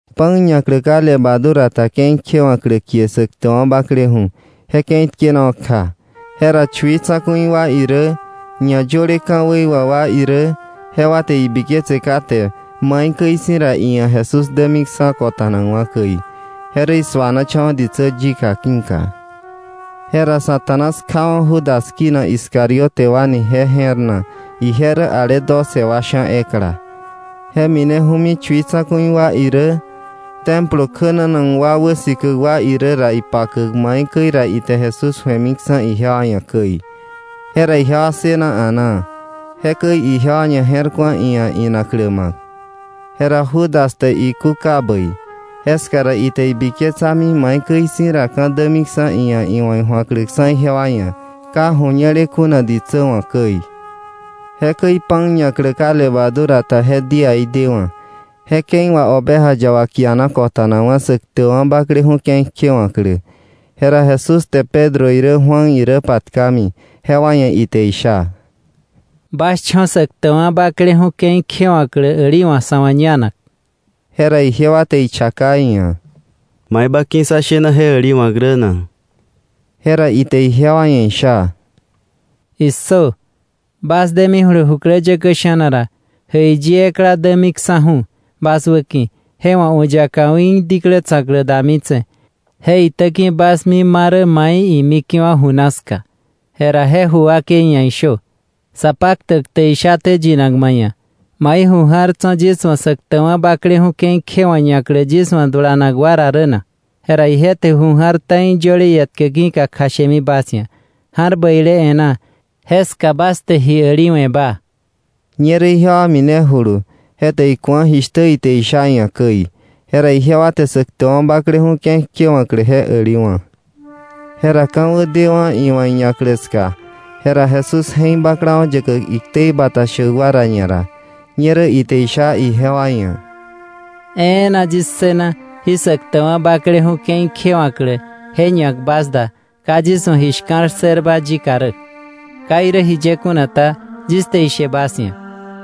Pan ñaklä ka levadura ta ke̱i kjewa̱klä kie Säktäkwa̱ Bakleju̱ je ke̱i tkenawa̱ kja. Jera chui tsa̱ku̱i wa irä ñayöle ka̱wei wà wa irä, jewa te ibiketse kate maikäi si̱ ra iia̱ Jesús dämiksa̱ kota̱nakwa̱ käi, je rä isuanachawa̱ ditsä yika ki̱ka. Jera Satanás kjawa̱ Judas kinak Iscariote wa ni je je̱r na; ije rä ale doce wa sha̱ ekla. Je mineju̱mi chui tsa̱ku̱i wa irä Templo kjänanak wa wäsikäk wa irä ra, ipakäk maikäi ra ite Jesús ju̱emiksa̱ ijewa ia̱ käi. Jera ijewa ssëna a̱naa, jekäi ijewa ñaje̱rku̱a iia̱ inaklä ma̱k. Jera Judas te ikúka bäi, jeska ra ite ibiketsami maikäi si̱ ra ka̱ dämiksa̱ iia̱ iwa̱ iju̱akläksa̱ ijewa ia̱, ka ju̱ñele kuna ditsä wa̱ käi. Jekäi pan ñaklä ka levadura ta je díaí dewa̱, je ke̱i wà oveja yaba kiana kota̱nakwa̱ Säktäkwa̱ Bakleju̱ ke̱i kjewa̱klä. Jera Jesús te Pedro irä Juan irä patkami, jewa ia̱ ite isha: —Bas cho̱ Säktäkwa̱ Bakleju̱ ke̱i kjewa̱klä äliwa̱k, sa̱ wa̱ iñaklä. Jera ijewa te ichaka iia̱: —¿Mai ba ki̱ sá shena je äliwa̱k rä na? Jera ite ijewa ia̱ isha: —¡Issö! Bas demijulu jukläyäkä sha̱na ra, jäiyi ekla dämiksa̱ju̱ bas wäki̱, je wa̱ u̱ yaka u̱í diklä tsa̱klä damitse̱. Je itäki bas mi ma rä mai imike̱wa̱ ju na ska. Jera je ju wakei ia̱ ishö: ‘Sapaktäk te ishaté yinak ma ia̱: ¿Mai ju ja̱r tso̱ yis wa̱ Säktäkwa̱ Bakleju̱ ke̱i kjewa̱klä ñaklä yis wa̱ dulanak wa ra rä na? Jera ije te ju ja̱r ta̱i yöle ietkä ki̱ka kjashemi bas ia̱, ja̱r bäile e̱ná. Jeska bas te ji äliwe̱ba. Ñerä ijewa minejulu; je te iku̱a jishtä ite isha iia̱ käi. Jera ijewa te Säktäkwa̱ Bakleju̱ ke̱i kjewa̱klä je äliwa̱. Jera ka̱wä dewa̱ iwa̱ iñaklä ska, jera Jesús je̱k baklawa̱ yäkäk iktei bata shäk wa ra ñara. Ñerä ite isha ijewa ia̱: —¡E̱e̱na yis ssëna jí Säktäkwa̱ Bakleju̱ ke̱i kjewa̱klä je ñak bas da ka yis wa̱ ji shka̱l ssërba yika rä! Ka irä jiye kuna ta, yis te ishe bas ia̱,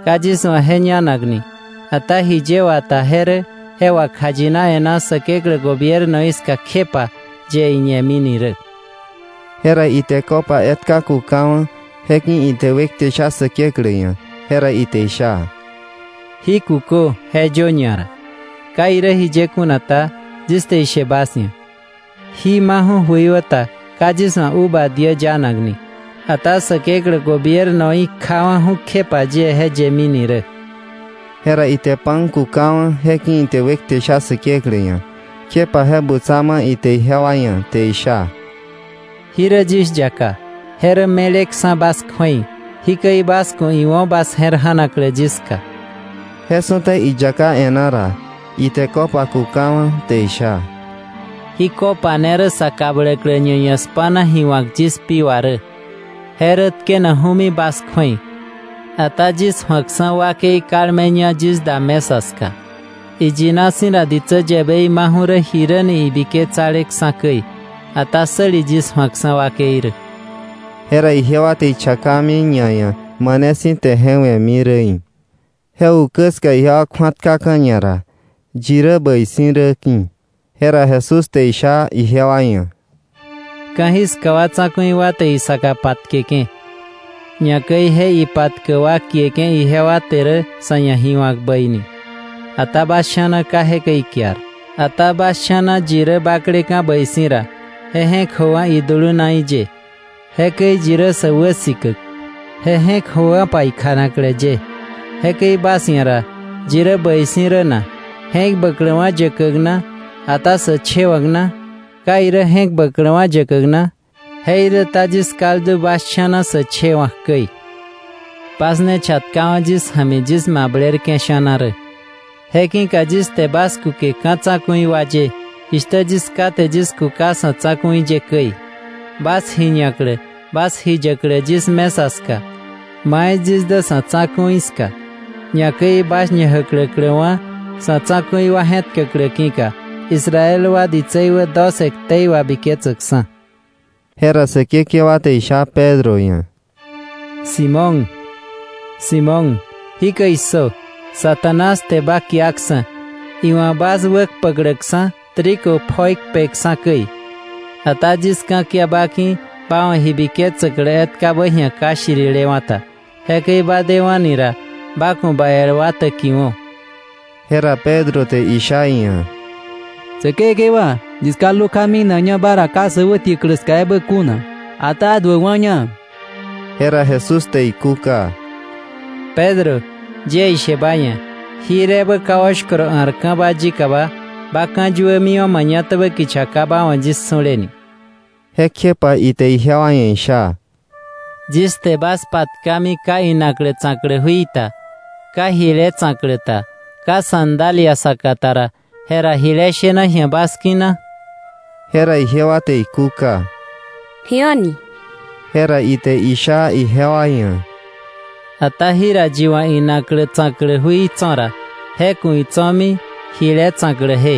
ka yis wa̱ je ñanakni, ata jiye wata je rä je wakjayina e̱ná Säkeklä gobiernoí ska kjepa yie je ñemini rä. Jera ite copa etka kukawa̱, je ki̱ ite wekte sha Säkeklä ia̱, jera ite isha: —Jí kukö, je yö ñara. Ka irä jiye kuna ta, yis te ishe bas ia̱, jí maju̱ jöiwäta ka yis wa̱ uva diä yanakni, ata Säkeklä gobiernoí kjawa̱ju̱ kjepa yie je yëmini rä. Jera ite pan kukawa̱, je ki̱ ite wekte sha Säkeklä ia̱, kjepa je butsa ma̱ ite ijewa ia̱, te isha: —Jí rä yis yaka. Je rä me̱leksa̱ bas kju̱ei. Jikäi bas ku̱ iwo̱ bas je̱r ja̱naklä yis ka. Je su̱ta iyaká e̱ná ra, ite copa kukawa̱ te isha: —Jí copa ne rä sa kabläklä ñaia̱ spa̱na ji wa̱k yis pi wà rä; je rä tkenakju̱mi bas kju̱ei. Ata yis ju̱akksa̱ je wakei kalmeña yis da mesa ska. Iyina si̱ ra ditsä yäbei maju̱mi rä jiräni ibiketsaleksa̱ käi, ata ¡säli je ju̱akksa̱ wakei rä! Jera ijewa te ichakami ñaia̱ mane si̱ te je we̱mi räí̱. Je ukä ska ijewa kju̱atkaka̱ ñara yi rä bäi si̱ rä ki̱. Jera Jesús te isha ijewa ia̱: “Ka̱jiska wa tsa̱ku̱i wa te isaka patkeke̱, ñakäi je ipatkäk wa kieke̱ ijewa te rä sa̱ ia̱ ji wa̱k bäi ni. Ata bas sha̱na ka jekäi ikiar. Ata bas sha̱na yi rä bakleka̱ bäi si̱ ra, je je̱k jöwo̱pa idulunaí ye. Jekäi yi rä sä wäsikäk, je je̱k jöwo̱pa ikjanaklä ye. Jekäi bas ia̱ ra ¿yi rä bäi si̱ rä na, je̱k bäkläkwa̱ yäkäk na, ata sä chewa̱k na? ¿Ka irä je̱k bäkläkwa̱ yäkäk na? Jeiräta yis kaldu bas sha̱na sä chewa̱k käi. “Bas ne chatkawa̱ yis ja̱mi yis mablerke̱ sha̱na rä. Je ki̱ka yis te bas kuke ka̱ tsa̱ku̱i wa ye jishtä yis Ká te yis kuka sa̱ tsa̱ku̱i ye käi, bas ji ñaklä, bas ji yäklä yis mesa ska, mai yis dä sa̱ tsa̱ku̱i ska, ñakäi bas ñajäkläkläwa̱ sa̱ tsa̱ku̱i wa je̱tkäklä ki̱ka, Israel wa ditsei wä doce ktei wabiketsäkksa̱.” Jera Säkekewa te isha Pedro ia̱: —Simón, Simón, ¡jikäi issö! Satanás te ba kiaksa̱, iwa̱ bas wäkpäkläksa̱ trigo pjoi kpeksa̱ käi. Ata yis ka̱kia ba ki̱ ba wa̱ ji biketsäklä etkabä ji̱a ka shirilewa̱ ta. Jekäi ba dewa̱ni ra, ba ku̱ ba el wa täkiwo̱. Jera Pedro te isha iia̱: —Säkekewa, yis kaldu kja minakña ba ra ka sä wätiäklä ska ebä kuna, ata duäkwa̱ña. Jera Jesús te ikúka: —Pedro, yie ishe ba ia̱, jir ebä ka oshkoro a̱rka̱ba yikaba, ba ka̱yuämiwa̱ mañatabä kicha ka ba wa̱ yis su̱le ni. Jekjepa ite ijewa ia̱ isha: —Yis te bas patkami ka inaklä tsa̱klä jui ta, ka jile tsa̱klä ta, ka sandalia saka ta ra, jera ¿jile shena ji̱a bas ki̱ na? Jera ijewa te ikúka: —Ji a̱ni. Jera ite isha ijewa ia̱: —Ata jira yi wa̱ inaklä tsa̱klä jui tso̱ ra, je ku̱ itso̱mi jile tsa̱kläje,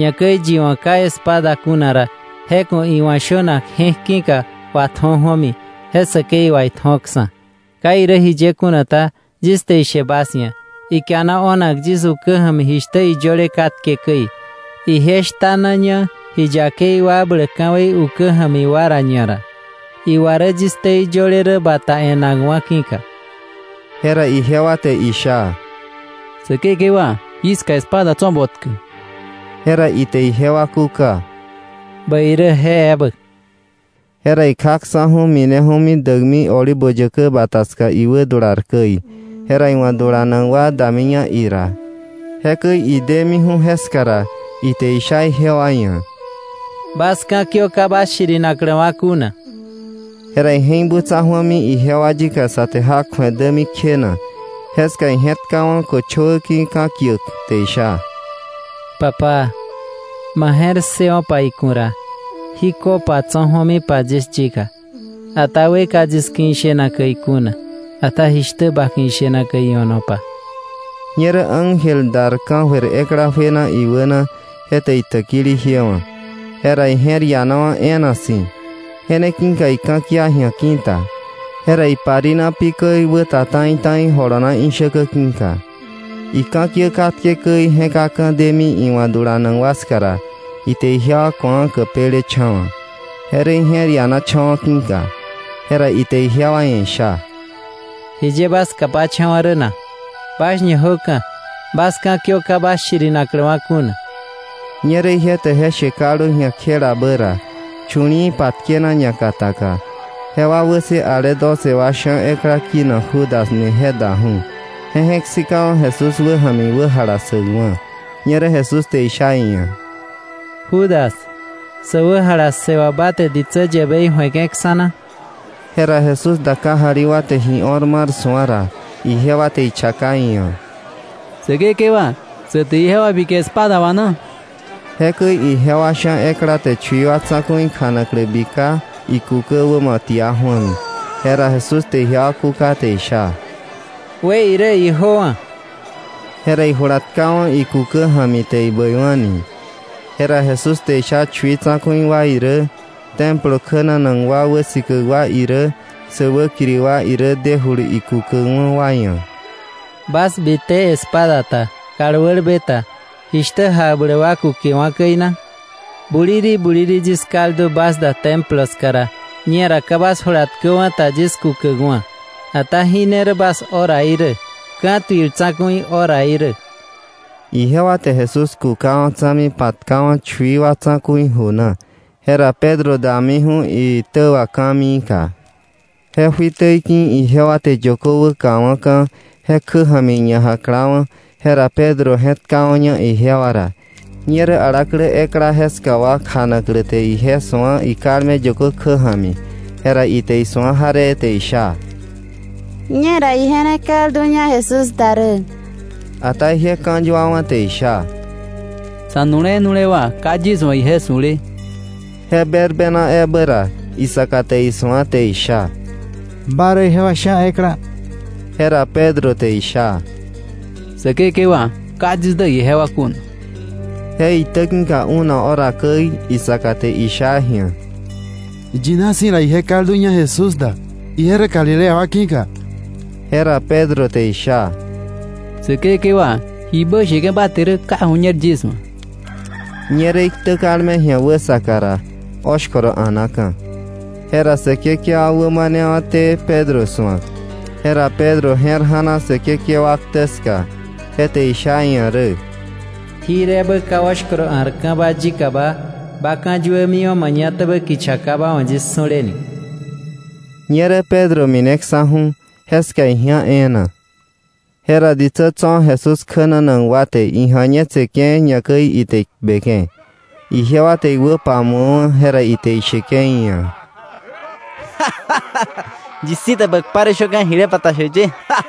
ñakäi yi wa̱ ka espada kuna ra, je ku̱ iwa̱ shönak je̱k ki̱ka watju̱o ju̱omi, je säkei wà itju̱oksa̱. Ka irä jiye kuna ta, yis te ishe bas ia̱, ikiana o̱nak yis ukä ja̱mi jishtä iyöle katke käi: “Ije shtanaña ji yakei wakbläk ka̱wei ukä ja̱mi wa ra ñara.” Iwa rä yis ktei yöle rä bata e̱nakwa̱ ki̱ka. Jera ijewa te isha: —Säkekewa, jiska espada tso̱ botkä. Jera ite ijewa kúka: —Bäi rä, je ebä. Jera ikjaksa̱ju̱, mineju̱mi däkmi Olivo Yäkä Bata ska iwädular käi, jera iwa̱ dulanak wa damiña ira. Jekäi idemiju̱ jeska ra, ite isha ijewa ia̱: —Bas ka̱kiö ka bas shirinakläwa̱ kuna. Jera ije̱k butsa ju̱ami ijewa yika sä te jak ju̱e dämi kjena. Jeska ije̱tkawa̱ köchöwä ki̱ ka̱kiäk, te isha: “Papá, ma je̱r ssëwo̱pa iku̱ ra, jí copa tso̱ ju̱omipa yis yika. Ata we ka yis ki̱ ishena käi kuna, ata jishtä ba ki̱ ishena käi io̱nopa.” Ñerä ángel dar ka̱jöir ekla juena iwäna, je te itäkili jiewa̱. Jera ije̱r ianawa̱ e̱e̱na si̱. Je ne ki̱ka ika̱kia ji̱a ki̱ta, jera iparina pi käi wäta ta̱i ta̱i jolona ishäkä ki̱ka. Ika̱kiä katke käi ije̱kaka̱ deni iwa̱ dulanak wa ska ra, ite ijewa ku̱a käpelecha̱wa̱, je rä ije̱r ianacha̱wa̱ ki̱ka. Jera ite ijewa ia̱ isha: —¿Jiye bas kapacha̱wa̱ rä na? Bas ñajöka̱. Bas ka̱kiö ka bas shirinakläwa̱ kuna. Ñerä ije te je she kaldu ji̱a kjela bä ra, chu̱li̱i̱ patkena ñakataka, jewa wäkse ale doce wa sha̱ ekla kinak Judas ni je daju̱, je je̱k sikawa̱ Jesús wäja̱mi iwä jalassäkwa̱. Ñerä Jesús te isha iia̱: —Judas, ¿sä wä jalassë wà ba te ditsä yäbei ju̱eke̱ksa̱ na? Jera Jesús da kajali wa te ji o̱r mar su̱a ra, ijewa te ichaka iia̱: —Säkekewa, ¿sä te ijewa bike espada wà na? Jekäi ijewa sha̱ ekla te chui wa tsa̱ku̱i kjanaklä bika, ikukä wämo tia ju̱ami. Jera Jesús te ijewa kuka te isha: —We irä; ijöwa̱. Jera ijula tkawa̱ ikukä ja̱mi te ibäiwa̱ni. Jera Jesús te isha chui tsa̱ku̱i wa irä, Templo kjänanak wa wäsikäk wa irä, sä wäkiri wa irä dejulu ikukäkwa̱ wa ia̱: —¿Bas bite espada ta, kal wälbe ta, jishtä jakbläk wa kukewa̱ käi na? Buliri buliri yis kaldu bas da Templo ska ra, ñera ka bas jula tkäwa̱ ta yis kukäkwa̱, ata jí ne rä bas horaí rä, ka̱tuil tsa̱ku̱i horaí rä. Ijewa te Jesús kukawa̱ tsa̱mi patkawa̱ chui wa tsa̱ku̱i ju na. Jera Pedro damiju̱ iitä wà ka̱miika. Je juitä ki̱ ijewa te yökö wäkawa̱ka̱ je kjä ja̱mi iña jakla̱wa̱, jera Pedro je̱tkawa̱ña ijewa ra. Ñerä alaklä ekla jeska wa kjanaklä te ije su̱a ikalme yökö kjä ja̱mi. Jera ite isu̱a jaree te isha: —Ñera ije ne kalduña Jesús da rä. Ata ije ka̱yuawa̱ te isha: —Sa̱nule̱ nule̱wa̱, ka yis wa̱ ije su̱le. Je berbena ebä ra, isaka te isu̱a te isha: —Ba rä ijewa sha̱ ekla. Jera Pedro te isha: —Säkekewa, ka yis dä ijewa kuna. Je itä ki̱ka una hora käi, isaka te isha ji̱a: —Iyina si̱ ra ije kalduña Jesús da, ije rä Galilea wa ki̱ka. Jera Pedro te isha: —Säkekewa, jibä sheke̱ ba te rä ka ju̱ñer yis wa̱. Ñerä iktä kalme ji̱a wäsaka ra, oshkoro a̱naka̱. Jera Säkekewa wä manewa̱té Pedro su̱ak, jera Pedro je̱r ja̱na Säkekewa ktä ska, je te isha iia̱ rä: “Jir ebä ka oshkoro a̱rka̱ba yikaba, ba ka̱yuämiwa̱ mañatäbä kicha, ka ba wa̱ yis su̱le ni.” Ñerä Pedro mineksa̱ju̱ jeska iji̱á e̱e̱na. Jera ditsä tso̱ Jesús kjänanak wa te ija̱ñetseke̱, ñakäi ite ikpeke̱. Ijewa te iwä pamu̱awa̱, jera ite isheke̱ iia̱: —¡Yi si̱ te ba kpa rä shöka̱ jile bata shäk ye!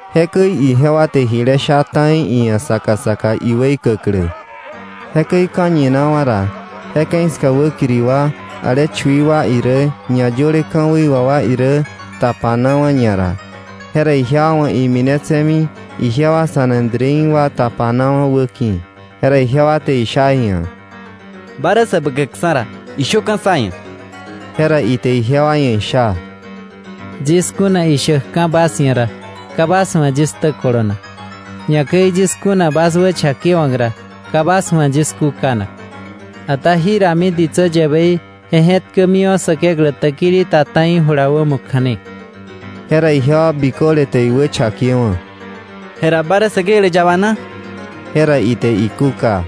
Jekäi ijewa te jile sha ta̱i iia̱ saka saka iweikäklä. Jekäi ka̱ñinawa̱ ra, je ke̱i ska wäkiri wa, ale chui tsa̱ku̱i wa irä ñayöle ka̱wei wà wa irä tapanawa̱ ñara. Jera ijewa wa̱ iminetse̱mi ijewa Sanedrín wa tapanawa̱ wäki̱. Jera ijewa te isha iia̱: —Ba rä Säbäkäkksa̱ ra, ¡ishöka̱ sá ia̱! Jera ite ijewa ia̱ isha: —Yis kuna ishäkka̱ bas ia̱ ra, ka bas wa̱ yis ktä kolonak. Ñakäi yis kuna bas wächakewa̱k ra, ka bas wa̱ yis kúkanak. Ata jirami ditsä yäbei je je̱tkämiwa̱ Säkeklä täkili ta ta̱i jula wämo kja̱ne. Jera ijewa biköle te iwächakewa̱: —Jera, ¿ba rä Säkeklä yaba na? Jera ite ikúka: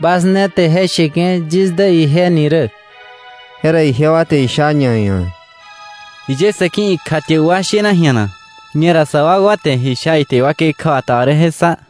—Bas ne te je sheke̱ yis dä ije ni rä. Jera ijewa te isha ñaia̱: —¿Jiye sa̱ ki̱ ikjatiäk wa shena ji̱a na? Ñera sa wakwa te ji sha ite iwakei kjäbata wa rä je ssa.